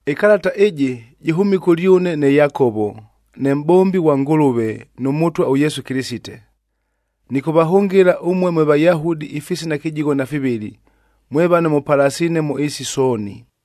Ɨkalata ɨjɨ jɨhʉmile kʉlyʉne ne Yakovo, ne mʼbombi ghwa Ngʉlʉve, nʉ Mʉtwa ʉYesu Kɨlɨsite. Nɨkʉvahʉngɨla ʉmue mwe Vayahudi ifisina kɨjigho na fivɨlɨ,a mwe vano mʉpalasiine mʉ ɨɨsi sooni.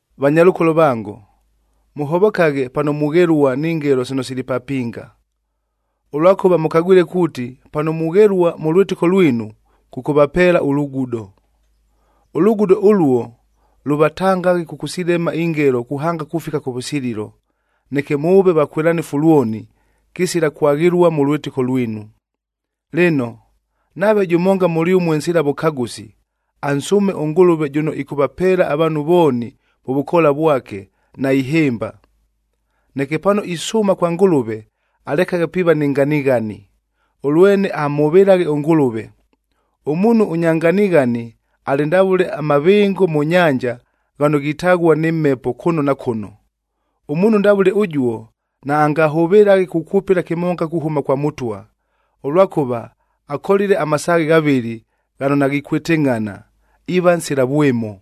Vanyalʉkolo vango, mʉhovokaghe pano mughelua ni ngelo sino sili papinga, ʉlwakʉva mʉkagwile kuuti pano mughelua mʉ lwɨtɨko lwinu, kʉkʉvapeela ʉlugudo. Ʉlugudo ʉluo lʉvatangaghe kʉkʉsilema ingelo kuhanga kufika kʉvʉsililo, neke mʉʉve vakwɨlanɨfu lwoni, kɨsila kwaghɨlua mʉ lwɨtɨko lwinu. Lɨno, nave jʉmonga mʉlyʉmue nsila vʉkagʉsi, ansʉʉme ʉNgʉlʉve jʉno ɨkʉvapeela avaanhu vooni mʉ vʉkoola vwake, naihɨmba. Neke pano isʉʉma kwa Ngʉlʉve, alekaghe piiva ni nganighani, ʉlwene amhʉvɨlaghe ʉNgʉlʉve. Ʉmuunhu ʉnya nganighani alɨ ndavʉle amavɨngo mʉ nyanja ghano ghitaghua nɨ mhepo kʉno na kʉno. Ʉmuunhu ndavʉle ʉjuo naangahʉvɨlaghe kukwʉpɨla kɨmonga kuhʉma kwa Mʉtwa, ʉlwakʉva akolile amasaaghe ghavɨlɨ ghano naghikwɨtɨngʼhana, iiva nsila vwɨmo.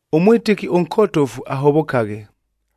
Ʉmwɨtɨki ʉnkotofu ahovokaghe,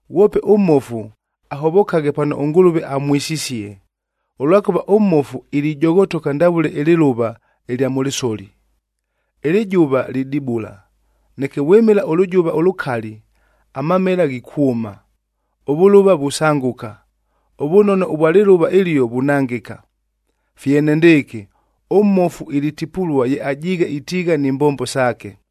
Ghwope ʉmmofu ahovokaghe pano ʉNgʉlʉve amwisisie, ʉlwakʉva ʉmmofu ilijoghotoka ndavʉle ɨlɨlʉva ɨlya mʉ lɨsoli. Ɨlɨjʉva lidibula, neke vwɨmɨla ʉlʉjʉva ʉlʉkali, amamela ghikwʉma, ʉvʉlʉva vusangʉka, ʉvʉnono ʉvwa lɨlʉva ɨlio vunangɨka. Fye enendɨɨkɨ, ʉmmofu ilitipulua ye ajiighe itiigha ni mbombo saake.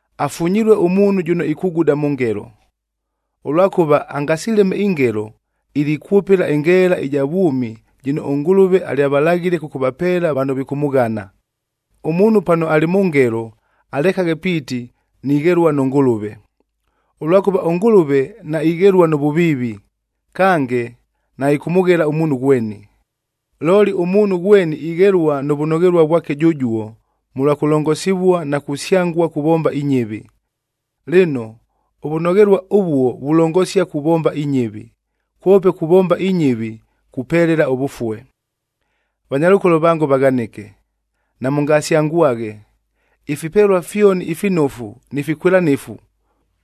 Afunyilue ʉmuunhu jʉno ikuguda mʉ ngelo, ʉlwakʉva angasileme ingelo, ilikwʉpɨla ɨngeela ɨja vwʉmi jɨno ʉNgʉlʉve alyavalaghile kʉkʉvapeela vano vikʉmʉghana. Ʉmuunhu pano alɨ mʉ ngelo, alekaghe piiti, “Nighelua nʉ Ngʉlʉve!” Ʉlwakʉva ʉNgʉlʉve naighelua nʉ vʉviivi, kange naɨkʉmʉghela ʉmuunhu ghweni. Looli ʉmuunhu ghweni ighelua nʉ vʉnoghelua vwake jʉjuo, mʉlwa kʉlongosivua na kusyangua kuvomba inyɨvi. Lɨno, ʉvʉnoghelua ʉvuo vulongosia kuvomba inyɨvi, kwope kuvomba inyɨvi kupelela ʉvʉfue. Vanyalʉkolo vango vaghanɨke, namʉngasyangwaghe. Ifipelua fyoni ifinofu ni fikwɨlanɨfu,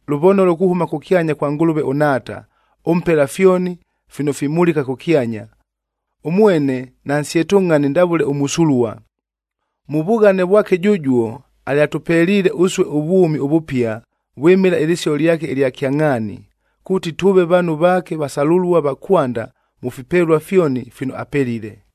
lʉvonolo kuhʉma kʉkyanya kwa Ngʉlʉve ʉNhaata, ʉmpela fyoni fino fimulika kʉkyanya. Ʉmwene nansyetʉngʼhani ndavʉle ʉmʉsulua. Mʉ vughane vwake jʉjuo, alyatʉpeliile ʉsue ʉvwʉmi ʉvʉpia vwɨmɨla ɨlɨsio lyake ɨlya kyangʼhaani, kuuti tʉʉve vaanhu vaake vasalʉlua va kwanda mʉ fipelua fyoni fino apelile.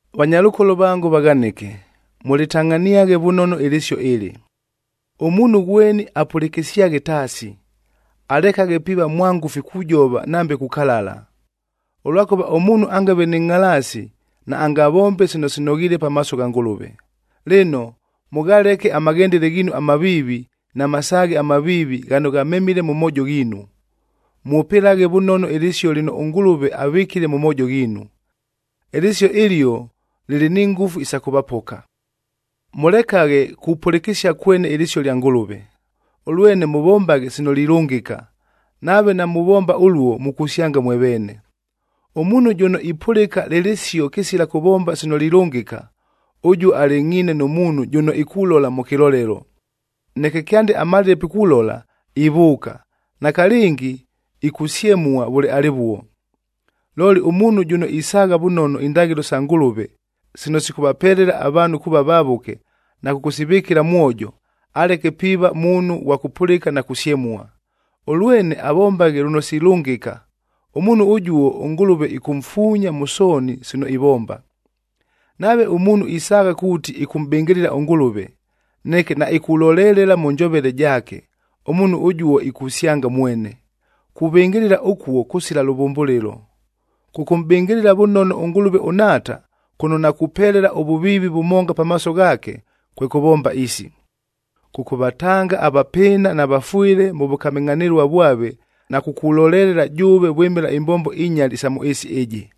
Vanyalʉkolo vango vaghanɨke, mʉlɨtangʼhaniaghe vʉnono ɨlɨsio ɨlɨ: Ʉmuunhu ghweni apʉlɨkɨsyaghe taasi, alekaghe piiva mwangʉfi kujova nambe kukalala, ʉlwakʉva ʉmuunhu angave nɨ ngʼhalaasi naangavombe sino sinoghiile pamaaso gha Ngʉlʉve. Lɨno, mʉghaleke amaghendele ghiinu amaviivi na masaaghe amaviivi ghano ghamemile mʉ moojo ghiinu. Mwʉpɨlaghe vʉnono ɨlɨsio lɨno ʉNgʉlʉve avɨkile mʉ moojo ghiinu. Ɨlɨsio ɨlio lɨlɨ ni ngʉfu isa kʉvapoka. Mʉlekaghe kupʉlɨkɨsia kwene ɨlɨsio lya Ngʉlʉve, ʉlwene mʉvombaghe sino lilʉngɨka, nave namuvomba ʉluo mukusyanga mwe veene. Ʉmuunhu jʉno ipʉlɨka lɨ lɨsio kɨsila kʉvomba sino lilʉngɨka, ʉjuo alɨngʼhiine nʉ muunhu jʉno ikulola mʉ kɨlolelo, neke kyande amalile pikulola, ivʉʉka, nakalɨngi ikusyemua vʉle alɨvuo. Looli ʉmuunhu jʉno isaagha vʉnono indaghɨlo sa Ngʉlʉve sino sikʉvapelela avaanhu kuuva vavʉke, na kʉkʉsivɨkɨla mwojo, aleke piiva muunhu ghwa kʉpʉlɨka na kusyemua, ʉlwene avombaghe lʉno silʉngɨka, ʉmuunhu ʉjuo ʉNgʉlʉve ɨkʉmfuunya mʉ sooni sino ivomba. Nave ʉmuunhu isaagha kuuti ɨkʉmʼbɨngɨlɨla ʉNgʉlʉve, neke naikulolelela mʉ njovele jaake, ʉmuunhu ʉjuo ikusyanga mwene, kuvɨngɨlɨla ʉkuo kʉsila lʉvʉmbʉlɨlo. Kʉkʉmʼbɨngɨlɨla vʉnono ʉNgʉlʉve ʉNhaata, kʉno nakupelela ʉvʉviivi vʉmonga pamaaso ghaake, kwe kʉvomba isi: kʉkʉvatanga avapɨɨna na vafwɨle mʉ vʉkamɨngʼhanɨlua vwave na kukulolelela jʉʉve vwɨmɨla imbombo inyali isa mʉ ɨɨsi ɨjɨ.